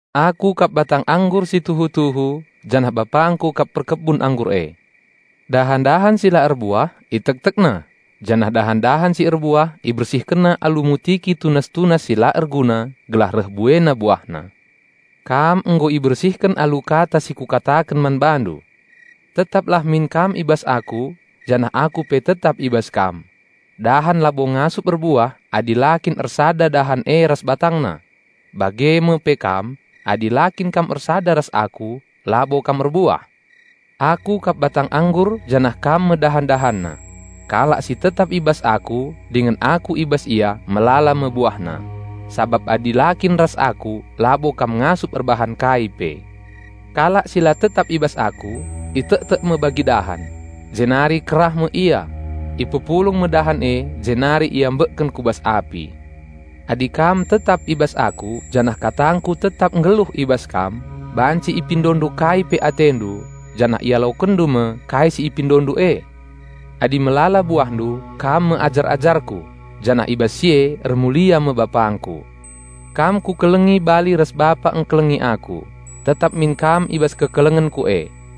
"Aku kap batang anggur si tuhu-tuhu, janah BapangKu kap perkebun anggur e. Dahan-dahan si la erbuah ItektekNa, janah dahan-dahan si erbuah IbersihkenNa alu mutiki tunas-tunas si la erguna gelah reh buena buahna. Kam nggo ibersihken alu kata si Kukataken man bandu. Tetaplah min kam i bas Aku, janah Aku pe tetap i bas kam. Dahan labo ngasup erbuah adi la kin ersada dahan e ras batangna. Bage me pe kam, adi la kin kam ersada ras Aku labo kam erbuah. Aku kap batang anggur janah kam me dahan-dahanna. Kalak si tetap i bas Aku dingen Aku i bas ia melala me buahna; sabap adi la kin ras Aku labo kam ngasup erbahan kai pe. Kalak si la tetap i bas Aku itektek me bagi dahan. Jenari kerah me ia. Ipepulung me dahan e jenari iambekken ku bas api. Adi kam tetap i bas Aku janah KatangKu tetap nggeluh i bas kam, banci ipindondu kai pe atendu, janah ialokenndu me kai si ipindondu e. Adi melala buahndu, kam me ajar-ajarKu, janah i bas si e ermulia me BapangKu. Kam Kukelengi bali ras Bapa engkelengi Aku; tetap min kam i bas kekelengenKu e.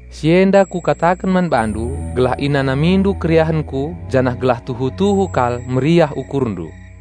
"Si enda Kukataken man bandu gelah inanamindu keriahenKu janah gelah tuhu-tuhu kal meriah ukurndu.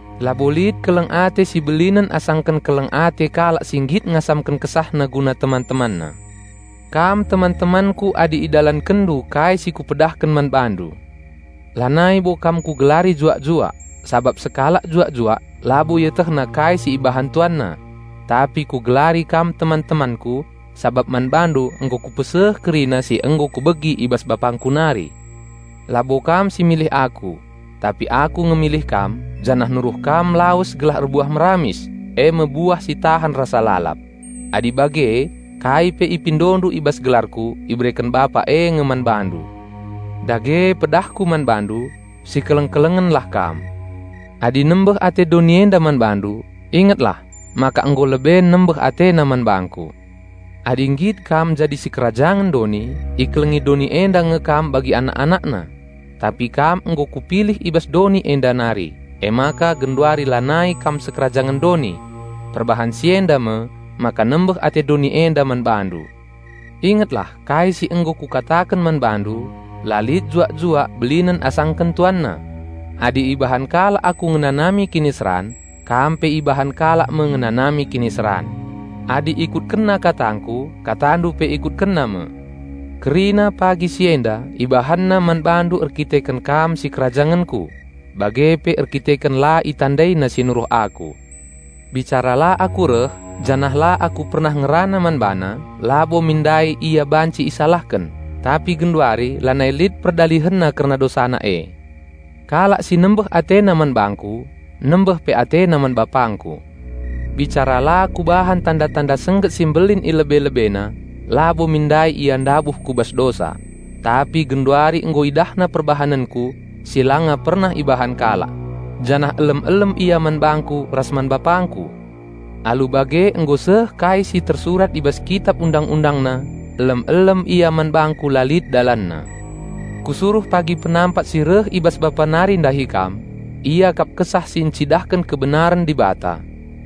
Labo lit keleng ate si belinen asangken keleng ate kalak si nggit ngasamken kesahna guna teman-temanna. Kam teman-temanKu adi idalankenndu kai si Kupedahken man bandu. Lanai bo kam Kugelari juak-juak, sabap sekalak juak-juak labo ietehna kai si ibahan tuanna. Tapi Kugelari kam teman-temanKu sabap man bandu nggo Kupeseh kerina si nggo Kubegi i bas BapangKu nari. Labo kam si milih Aku. Tapi Aku nge milih kam janah nuruh kam lawes gelah erbuah meramis, e me buah si tahan rasa lalap. Adi bage, kai pe ipindondu i bas gelarKu ibereken Bapa e nge man bandu. Dage pedahKu man bandu: Sikeleng-kelengenlah kam." "Adi nembeh ate doni enda man bandu, ingetlah maka nggo leben nembeh atena man bangKu. Adi nggit kam jadi sikerajangen doni, ikelengi doni enda nge kam bagi anak-anakna. Tapi kam nggo Kupilih i bas doni enda nari, emaka genduari lanai kam sikerajangen doni. Perbahan si enda me maka nembeh ate doni enda man bandu. Ingetlah kai si nggo Kukataken man bandu, 'La lit juak-juak belinen asangken tuanna.' Adi ibahan kalak Aku ngenanami kiniseran, kam pe ibahan kalak me ngenanami kiniseran. Adi ikutkenna katangKu, katandu pe ikutkenna me. Kerina pagi si enda ibahanna man bandu erdandanken kam sikerajangenKu; bage pe erdandanken la itandaina si Nuruh Aku. Bicara la Aku reh, janah la Aku pernah ngerana man bana, labo min ndai ia banci isalahken. Tapi genduari lanai lit perdalihenna kerna dosana e. Kalak si nembeh atena man bangKu, nembeh pe atena man BapangKu. Bicara la Kubahan tanda-tanda sengget si mbelin i lebe-lebena, labo min ndai ia ndabuh ku bas dosa; tapi genduari nggo idahna perbahanenKu, si langa pernah ibahan kalak, janah elem-elem ia man bangKu ras man BapangKu. Alu bage nggo seh kai si tersurat i bas kitap Undang-undangna, 'Elem-elem ia man bangKu la lit dalanna.' Kusuruh pagi Penampat si reh i bas Bapa nari ndahi kam. Ia kap Kesah si ncidahken kebenaren Dibata.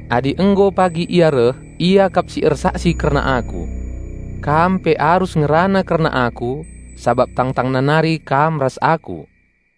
Adi nggo pagi reh Ia kap si eraksi kerna Aku. Kam pe arus ngerana kerna Aku, sabap tangtangna nari kam ras Aku."